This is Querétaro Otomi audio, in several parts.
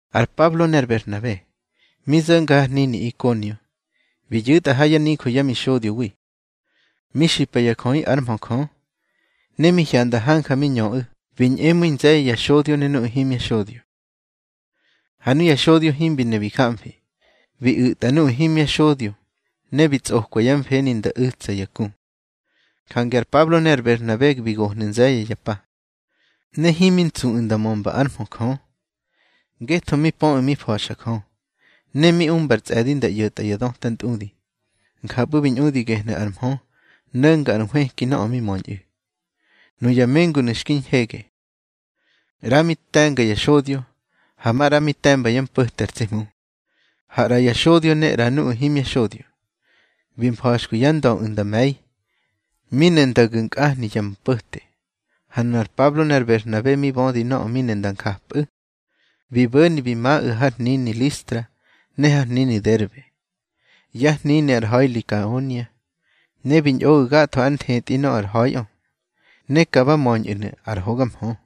Ar Pablo ne ar Berhnabe, mi zo̱nga har hnini Ikonio, bi yu̱tꞌa ha yá nijö yá mixodyowi, mi xipa ya jöꞌi ár mhö Jö. Ne mi hyanda hanja mi ñöꞌu̱, bi ñꞌemu̱i nze̱ye̱ ya xodyo ne nuꞌu̱ himya xodyo. Ha nuya xodyo himbi ne bi jamfi, bi u̱tꞌa nuꞌu̱ himya xodyo ne bi tsꞌokwa yá mfeni nda u̱tsa ya ku. Jange ar Pablo ne ar Berhnabe bi gohnu̱ nze̱ye̱ ya pa. Ne himi ntsuꞌu̱ nda mömba ár mhö Jö, ngetho mi pöꞌu̱ mi fa̱xa Jö, ne mi umbar tsꞌe̱di nda ꞌyo̱tꞌa ya dötꞌa ntꞌudi. Njapꞌu̱ bi ñꞌudi gehnu̱ ar mhö no̱nga ar nhwëki nöꞌö mi möñꞌu̱. Nuya mengunu̱ xki ñhege. ꞌRa mi te̱nga ya xodyo, ha maꞌra mi te̱mba yá mpo̱te ar tsi Hmu. Ha ꞌra ya xodyo ne ꞌra nuꞌu̱ himya xodyo, bi mfa̱xkwi yá ndöꞌu̱ nda me̱i, mi ne nda gu̱ nkꞌahni ya mpo̱te. Ha nunar Pablo ne ar Berhnabe mi bödi nöꞌö mi ne nda njapabiꞌu̱, bi bo̱ni bi maꞌu̱ har hnini Listra ne har hnini Derbe, yá hnini ar ha̱i Likaonia, ne bi ñꞌoꞌu̱ gatho ár nthetꞌi nöꞌö ar ha̱iꞌö. Ne ka ba möñꞌu̱nu̱ ar hoga mhö.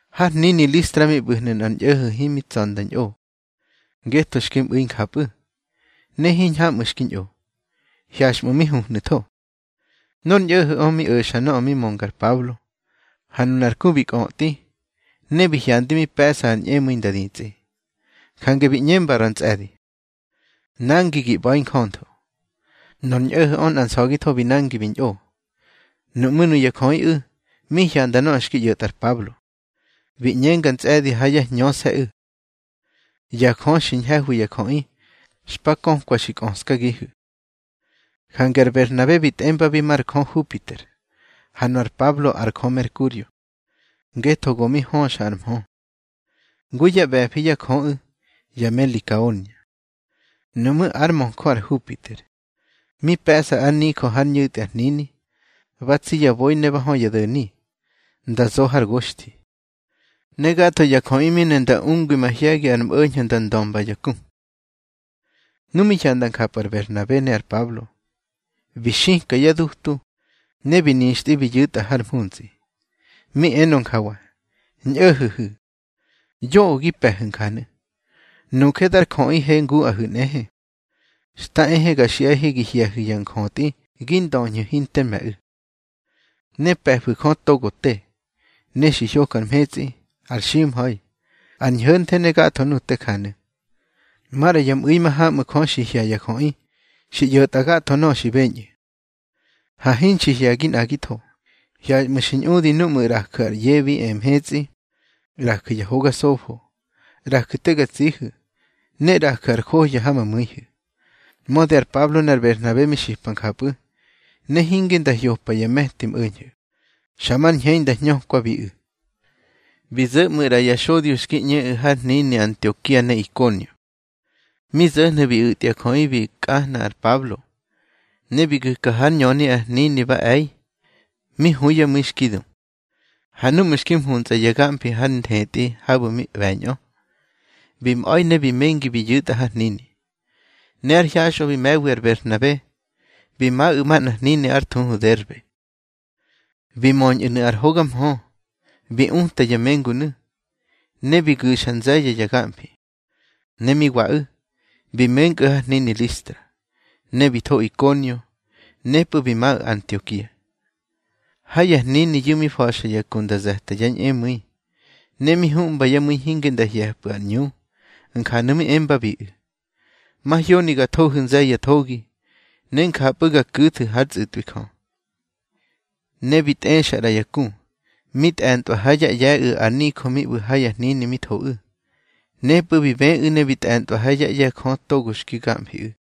Har hnini Listra mi ꞌbu̱hnu̱ nꞌar ñꞌo̱ho̱ himi tsa̱ nda ñꞌo, ngetho xki mꞌu̱i njapꞌu̱, ne hiñhamꞌu̱ xki ñꞌo, hyaxꞌmu̱ mi huhnu̱tho. Nor ñꞌo̱ho̱ꞌö mi o̱xa nöꞌö mi mönga ar Pablo, ha nunar ku bi kꞌötꞌi, ne bi hyandi mi pe̱ꞌsa ar ñꞌemu̱i nda ditsꞌi. Jange bi ꞌñenga ra ntsꞌe̱di: —Nangi gi ꞌba̱i njöntho. Nor ñꞌo̱ho̱ꞌö nꞌa nsa̱githo bi nangi bi ñꞌo. Nuꞌmú̱ nuya jöꞌiꞌu̱ mi hyanda nöꞌö xki ꞌyo̱tꞌa ar Pablo, bi ꞌñenga ntsꞌe̱di ha yá hñöse̱ꞌu̱: —Ya jö xi ñhe̱hwi ya jöꞌi, xpa kökwa xi kꞌöskagihu̱. Jange ar Berhnabe bi tꞌembabi mar jö Hupiter, ha nu ar Pablo ar jö Merkurio, ngetho go mi höxa ar mhö, ngu yá ꞌbe̱fi yá jöꞌu̱ ya me Likaonia. Nuꞌmú̱ ár möjö ar Hupiter, mi pe̱ꞌsa ár nijö hár ñu̱tꞌi ar hnini, ba tsi ya boi ne ba hö ya do̱ni, nda zo har goxthi. Ne gatho ya jöꞌi mi ne nda ungwi mahye̱gi ar mꞌo̱ñho̱ nda ndömba ya ku. Nu mi hyanda njapꞌu̱ ar Berhnabe ne ar Pablo, bi xika yá dutu, ne bi nixtꞌi bi yu̱tꞌa har mhuntsꞌi. Mi enö njawa: —Ñꞌo̱ho̱hu̱, yoꞌö gi pe̱hu̱ njanu̱. Nuje dar jöꞌihe nguꞌahu̱ nꞌehe. Xta ehe ga xiꞌahe gi hye̱hu̱ ya njötꞌi gi ndöñhu̱ hinter me̱ꞌu̱. Ne pe̱fu̱ Jö togo te, ne xi hyoka mhetsꞌi, ar ximha̱i, ar ñho̱nthe, ne gatho nuꞌu̱ te janu̱. Maꞌra ya mꞌu̱i mahamꞌu̱ Jö xi hye̱ ya jöꞌi xi ꞌyo̱tꞌa gatho nöꞌö xi beñꞌu̱. Ha hinxi hye̱gi nꞌagitho. Hyaxꞌmu̱ xi ñꞌudi núꞌmu̱ ꞌraju̱ ar ꞌye bi e mhetsꞌi. ꞌRaju̱ ya hoga sofo, ꞌraju̱ te ga tsihu̱, ne ꞌraju̱ ar johya ha ma mu̱ihu̱. Mödi ar Pablo ne ar Berhnabe mi xipa njapꞌu̱, ne hinge nda hyompa ya me̱ti mꞌo̱ñho̱, xa mar ñhei nda hñökwabiꞌu̱. Bi zo̱ ꞌmu̱ ꞌra ya xodyo xki ꞌñeꞌu̱ har hnini Antiokia ne Ikonio. Mi zo̱hyu̱ bi u̱tya jöꞌi bi kꞌahna ar Pablo, ne bi gu̱ka hár ñöni ar hnini ba e̱i, mi hu yá mu̱i xki du. Ha núꞌmu̱ xki mhuntsꞌa ya gamfi har nthetꞌi habu̱ mi ꞌbe̱ñꞌö, bi mꞌa̱i ne bi mengi bi yu̱tꞌa har hnini. Ne ár hyaxꞌö bi me̱wi ar Berhnabe, bi maꞌu̱ manꞌar hnini ár thuhu Derbe. Bi möñꞌu̱nu̱ ar hoga mhö, bi uta ya mengunu̱, ne bi gu̱xa nze̱ye̱ ya gamfi. Ne mi waꞌu̱, bi menkꞌu̱ har hnini Listra, ne bi tho Ikonio, nepꞌu̱ bi maꞌu̱ Antiokia. Ha ya hniniyu̱ mi fa̱xa ya ku nda ze̱ta yá ñꞌemu̱i, ne mi huꞌmba yá mu̱i hinge nda hye̱pꞌu̱ ar ꞌñu. Njanu̱ mi embabiꞌu̱: —Mahyoni ga thohu̱ nze̱ye̱ ya thogi, ne njapꞌu̱ ga ku̱thu̱ hár tsꞌu̱tꞌwi Jö. Ne bi tꞌexa ꞌra ya ku, mi tꞌe̱ntꞌwa ha yá ꞌye̱ꞌu̱ ar nijö mi ꞌbu̱ ha ya hnini mi thoꞌu̱. Nepꞌu̱ bi bëꞌu̱ ne bi tꞌe̱ntꞌwa ha yá ꞌye̱ Jö togo xki gamfiꞌu̱.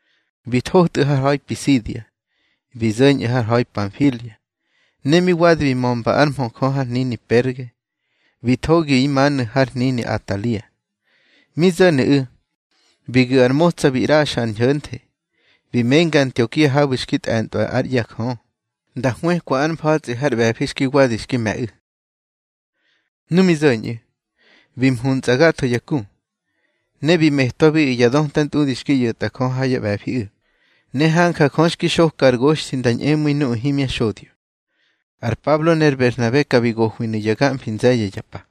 Bi thotꞌu̱ har ha̱i Pisidia, bi zo̱ñꞌu̱ har ha̱i Panfilia. Ne mi wadi bi mömba ár mhö Jö har hnini Perge, bi thogi imanu̱ har hnini Atalia. Mi zo̱nu̱ꞌu̱, bi gu̱ ar motsa bi ꞌraxa ar ñho̱nthe, bi menga Antiokia habu̱ xki tꞌe̱ntꞌwa ár ꞌye̱ Jö, nda hwëkwa ár mfa̱tsꞌi har ꞌbe̱fi xki wadi xki me̱ꞌu̱. Nu mi zo̱ñꞌu̱, bi muntsꞌa gatho ya ku, ne bi metwabiꞌu̱ ya döta ntꞌudi xki ꞌyo̱tꞌa Jö ha yá ꞌbe̱fiꞌu̱, ne hanja Jö xki xoka ar goxthi nda ñꞌemu̱i nuꞌu̱ himya xodyo. Ar Pablo ne ar Berhnabe ka bi gohwinu̱ ya gamfi nze̱ye̱ ya pa.